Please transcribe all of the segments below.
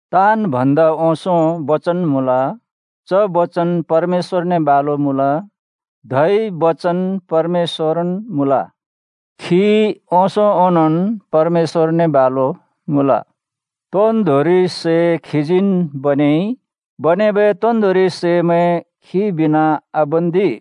ताँन् भन्दा ओंसों बचन मुँल। च बचन परमेश्‍वरने बालु मुँल। धै बचन परमेश्‍वरन् मुँल। खी ओंसों ओंनोंन् परमेश्‍वरने बालु मुँल। तोन्दोंरि सै खीजीन् बनेइ, बनेबै तोन्दोंरि सैमैं खी बिना आबन्दि।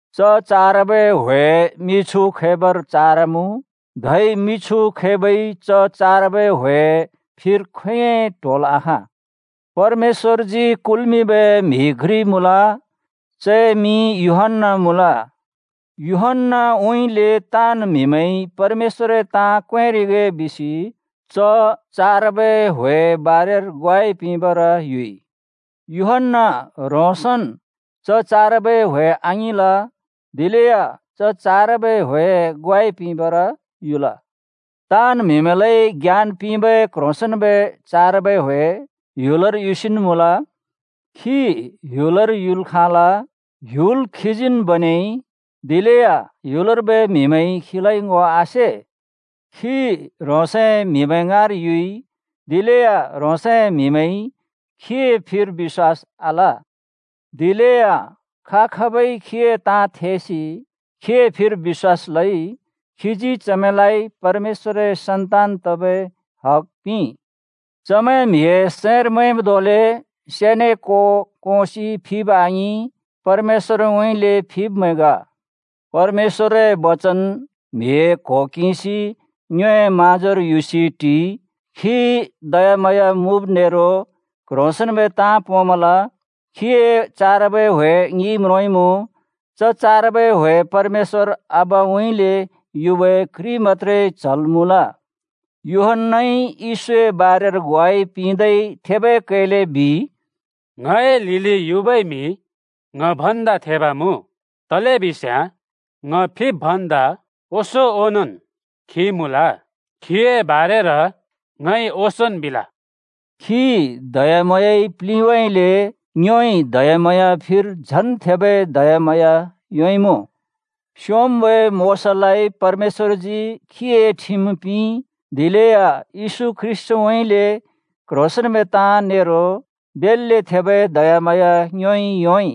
च चारबै ह्‍वे मिछु खैबर चारमुँ, धै मिछु खैबइ च चारबै ह्‍वेए फिर खोंयोंइ ट्होल् आखाँ। परमेश्‍वरजी कुल्मिंबै म्हि घ्रि मुँल। चए मिं यूहन्‍‍ना मुँल। यूहन्‍नाउँइँले ताँन् म्हिमैंइ परमेश्‍वरए ताँ क्वेंरिगे बिसि च चारबै ह्‍वेए बारेर ग्वाइ पिंबर युइ। यूहन्‍ना ह्रोंसन् च चारबै ह्‍वे आङिंल, दिलेया च चारबै ह्‍वेए ग्वाइ पिंबर युल। ताँन् म्हिमैंलाइ ज्ञान पिंबै क्‍ह्रोंसेंन्‍बै चारबै ह्‍वे ह्‍युलर युसिन् मुँल। खी ह्‍युलर युल् खाँल। ह्‍युल खीजीन् बनेइ, दिलेया ह्‍युलर्बै म्हिमैंइ खीलाइ ङो आसे। खी ह्रोंसए म्हिमैं ङाँर युइ, दिलेया ह्रोंसए म्हिमैंइ खीए फिर बिश्‍वास आल। दिलेया खा-खाबइ खीए ताँ थेसि खीए फिर बिश्‍वास लइ, खीजी चमैंलाइ परमेश्‍वरए सन्तान तबै हग पिंइ। चमैं म्हिए सैंर मैंब् धोंले से ने को कोंसि फिब आङिं, परमेश्‍वरउँइँले फिब्मैं ग। परमेश्‍वरए बचन म्हिए क्हो किंसि ङ्योए म्हाँजोर युसि टिइ। खी दयाम्हाँया मुँब नेरो कह्रोंसेंन्बै ताँ पोंमल खीए चारबै ह्‍वे ङिइ म्रोंइमुँ, च चारबै ह्‍वे परमेश्‍वर आबाउँइँले युबै घ्रि मत्‍त्रे च्‍हल् मुँल। यूहन्‍नाइ येशूए बारेर ग्वाइ पिंदै थेबै कैले बिइ, “ङए लिलि युबै म्हि ङ भन्दा थेब मुँ, तलेबिस्याँ ङ फिब् भन्दा ओंसों ओंनोंन् खी मुँल। चए बारेर ङइ ओंसोंन् बिल।” खी दयाम्हाँयाइ प्लिंबइले ङ्योइ दयाम्हाँया फिर झन् थेबै दयाम्हाँया योंइँमुँ। स्‍योंम्‍बै मोशालाइ परमेश्‍वरजी खीए ठिम पिंइ, दिलेया येशू ख्रीष्‍टउँइँले क्‍ह्रोंसेंन्‍बै ताँ नेरो बेल्‍ले थेबै दयाम्हाँया ङ्योइ योंइ।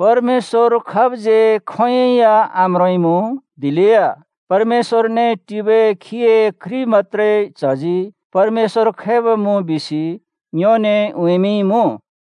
परमेश्‍वर खाबज्यै खोंयोंइ या आम्रोंइँमुँ, दिलेया परमेश्‍वरने टिबै खीए घ्रि मत्‍त्रे च्‍हजी परमेश्‍वर खैब मुँ बिसि ङ्योने उँइँमिंइँमुँ।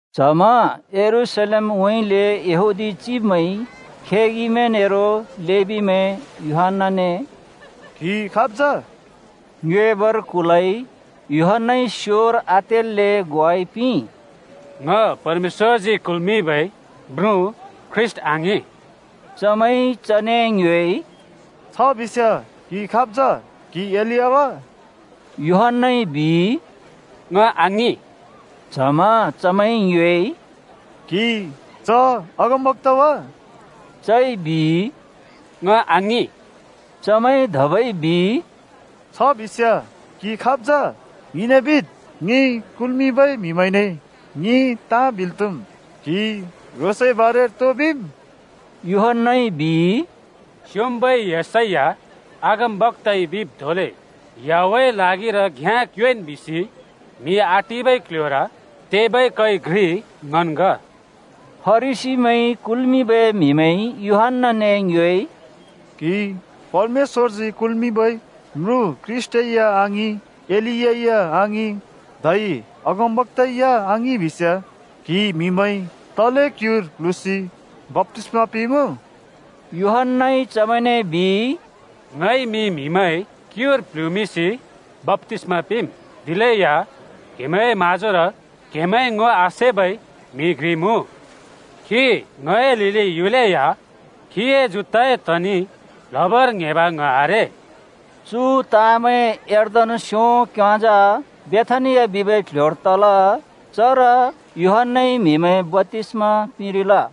च्हमा यरूशलेमउँइँले यहूदी चिब्मैंइ खेगिमैं नेरो लेबीमैं यूहन्‍नाने “क्‍हि खाब् जा?” ङ्योएबर कुलइ। यूहन्‍नाइ स्योर आतेल्‍ले ग्वाइ पिंइ, “ङ परमेश्‍वरजी कुल्मिंबै म्रुँ ख्रीष्‍ट आङिं।” चमैंइ चने ङ्योएइ, “छ बिस्‍याँ क्‍हि खाब् जा? क्हि एलिया वा?” यूहन्‍नाइ बिइ, “ङ आङिं।” च्हमा चमैंइ ङ्योएइ, “क्हि च अगमबक्‍ता वा?” चइ बिइ, “ङ आङिं।” चमैंइ धबै बिइ, “छ बिस्याँ क्‍हि खाब् जा? ङिने बिद्। ङि कुल्मिंबै म्हिमैंने ङिइ ताँ बिल् त्‍हुम्। क्‍हिइ ह्रोंसए बारेर तो बिम्?” यूहन्‍नाइ बिइ, “स्योंम्बै येशैया अगमबक्‍ताइ बिब् धोंले, ‘याहवेहए ल्हागिर घ्‍याँ क्योंएँन्!’ बिसि, म्हि आटिबै क्ल्ह्‍योर तेबै कै घ्रि ङन् ग।” फरिसीमैंइ कुल्मिंबै म्हिमैंइ यूहन्‍नाने ङ्योएइ, “क्‍हि परमेश्‍वरजी कुल्मिंबै म्रुँ ख्रीष्‍ट या आङिं, एलिया या आङिं, धै अगमबक्‍ता या आङिं, बिस्याँ क्हिइ म्हिमैं तले क्‍युर प्‍ल्हुँसि बप्‍तिस्‍मा पिंरिमुँ?” यूहन्‍नाइ चमैंने बिइ, “ङइ मि म्हिमैं क्‍युर प्‍ल्हुँसि बप्‍तिस्‍मा पिंम्, दिलेया क्‍हेमैंए म्‍हाँजोर क्‍हेमैंइ ङो आसेबै म्हि घ्रि मुँ। खी ङए लिलि युलेया खीए जुत्ताए तनि प्‍ल्ह्‍बर ङ्हेंब ङ आरे।” चु ताँमैं यर्दन स्‍यों क्‍योंजा बेथानिया बिबै क्‍ल्‍ह्‍योर तल। चर यूहन्‍नाइ म्हिमैं बप्‍तिस्‍मा पिंरिल।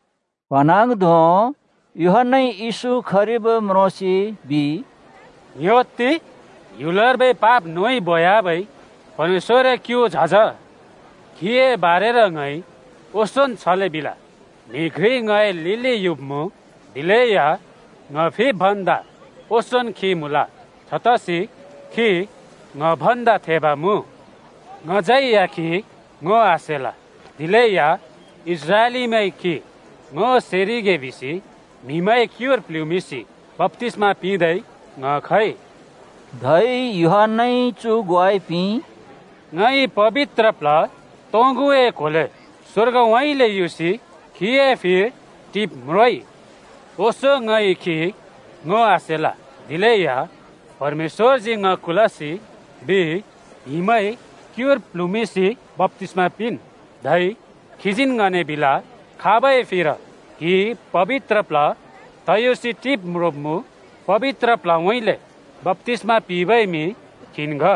प्‍हँन्हाँग्धों यूहन्‍नाइ येशू खरिब् म्रोंसि बिइ, “ङ्‌ह्‍योत्ति! ह्‍युलर्बै पाप नोइ बोयाबै परमेश्‍वरए क्‍यु झज। खीए बारेर ङइ ओंसोंन् छले बिल, ‘म्हि घ्रि ङए लिलि युब्‍मुँ, दिलेया ङ फिब् भन्दा ओंसोंन् खी मुँल। छतसि खी ङ भन्दा थेब मुँ।’ ङज्यै खी ङो आसेल, दिलेया इस्राएलीमैंइ खी ङो सेरिगे बिसि म्हिमैं क्‍युर प्‍ल्हुँमिंसि बप्‍तिस्‍मा पिंदै ङ खइ।” धै यूहन्‍नाइ चु ग्वाइ पिंइ, “ङइ पबित्र प्ल्ह तोंगुए क्होर स्वर्गउँइँले युसि खीए फिर टिब् म्रोंइ। ओंसों ङइ खी ङो आसेल, दिलेया परमेश्‍वरजी ङ कुलसि बिइ, ‘म्हिमैं क्युर प्ल्हुँमिंसि बप्‍तिस्‍मा पिंन्।’ धै खीजीन् ङने बिल, ‘खाबै फिर क्हिइ पबित्र प्ल्ह तयुसि टिब् म्रोंब्मुँ, पबित्र प्ल्हउँइँले बप्‍तिस्मा पिंबै म्हि खीन् ग।’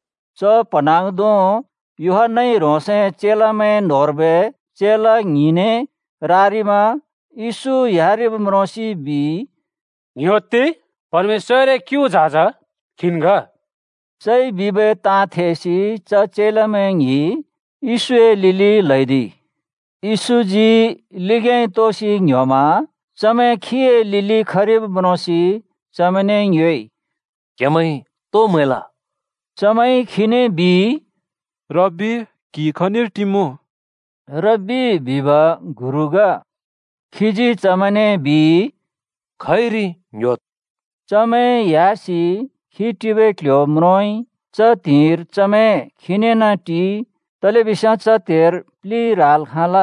च प्‍हँन्हाँग्धों यूहन्‍नाइ ह्रोंसए चेलामैं न्होंर्बै चेला ङ्हिंने रारिमा येशू ह्‍यारिब् म्रोंसि बिइ, “ङ्‌ह्‍योत्‍ति, परमेश्‍वरए क्‍यु झज खीन् ग।” चइ बिबै ताँ थेसि च चेलामैं ङ्हिं येशूए लिलि ल्हैदिइ। येशूजी लिग्‍याँइ तोसि ङ्‍ह्‍योमा चमैं खीए लिलि खरिब् म्रोंसि चमैंने ङ्योएइ, “क्हेमैंइ तो म्हैल?” चमैंइ खीने बिइ, “रब्बि, क्हि खनिर टिमुँ?”। (रब्बि बिब गुरु ग) खीजी चमैंने बिइ, “खइरि ङ्‍ह्‍योद्।” चमैं ह्‍यासि खी टिबै क्ल्ह्‍यो म्रोंइ। च त्हिंइर चमैं खीनेन् टिइ तलेबिस्याँ च त्हेर प्लि ह्राल् खाँल।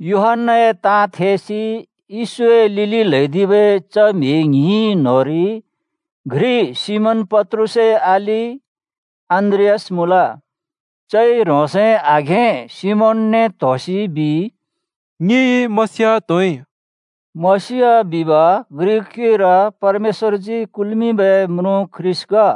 यूहन्‍नाए ताँ थेसि येशूए लिलि ल्हैदिबै च म्हि ङ्हिं न्‍होंरि घ्रि सिमोन पत्रुसए अलि अन्‍द्रियास मुँल। चइ ह्रोंसए आघें सिमोनने त्होसि बिइ, “ङिइ मसीह त्होइ।” (मसीह बिब ग्रिक क्युइर परमेश्‍वरजी कुल्मिंबै म्रुँ ख्रीष्‍ट ग।)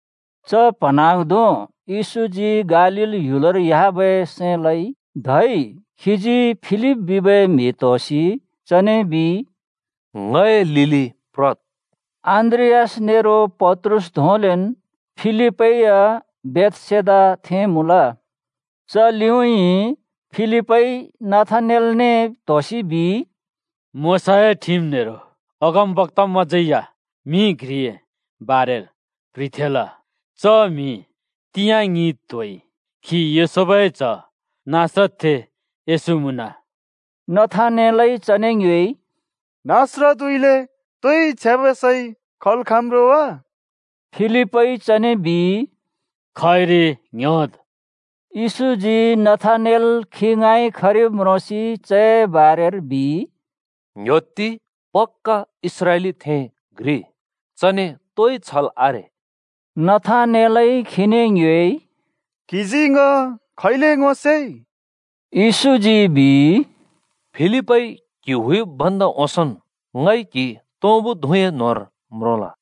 च प्‍हँन्हाँग्धों येशूजी गालील ह्‍युलर ह्‍याबै सैं लइ। धै खीजी फिलिप बिबै म्हि त्‍होसि चने बिइ, “ङए लिलि प्रद्।” अन्‍द्रियास नेरो पत्रुस धोंलेन् फिलिपै या बेथसेदाथें मुँल। च लिउँइँ फिलिपइ नथानेलने त्होसि बिइ, “मोशाए ठिम नेरो अगमबक्‍तामैंज्यै या म्हि घ्रिए बारेर प्ह्रिथेंल, च म्हि तिंयाँ ङिइ त्होइ खी योसेफए च्‍ह नासरतथें येशू मुँन।” नथानेलइ चने ङ्योएइ, “नासरतउँइँले तोइ छ्याँबै सै खल् खाँम्‌ रो वा?” फिलिपइ चने बिइ, “खइरि ङ्‍ह्‍योद्।” येशूजी नथानेल खी ङाँइ खरिब् म्रोंसि चए बारेर बिइ, “ङ्‌ह्‍योत्ति, पक्‍क इस्राएलीथें घ्रि। चने तोइ छल आरे।” नथानेलइ खीने ङ्योएइ, “क्‍हिजी ङ खैले ङो सेइ?” येशूजी बिइ, “फिलिपइ क्हि हुइब् भन्दा ओंसोंन् ङइ क्‍हि तुँबुए धुँ न्‍होंर म्रोंल।”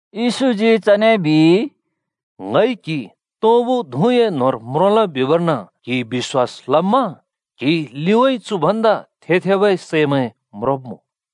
येशूजी चने बिइ, “ङइ क्हि तुँबुए धुँ न्‍होंर म्रोंल बिबर्न क्‍हिइ बिश्‍वास लम्मा? क्‍हिइ लिउँइँ चु भन्दा थे-थेबै सैमैं म्रोंब्‍मुँ।”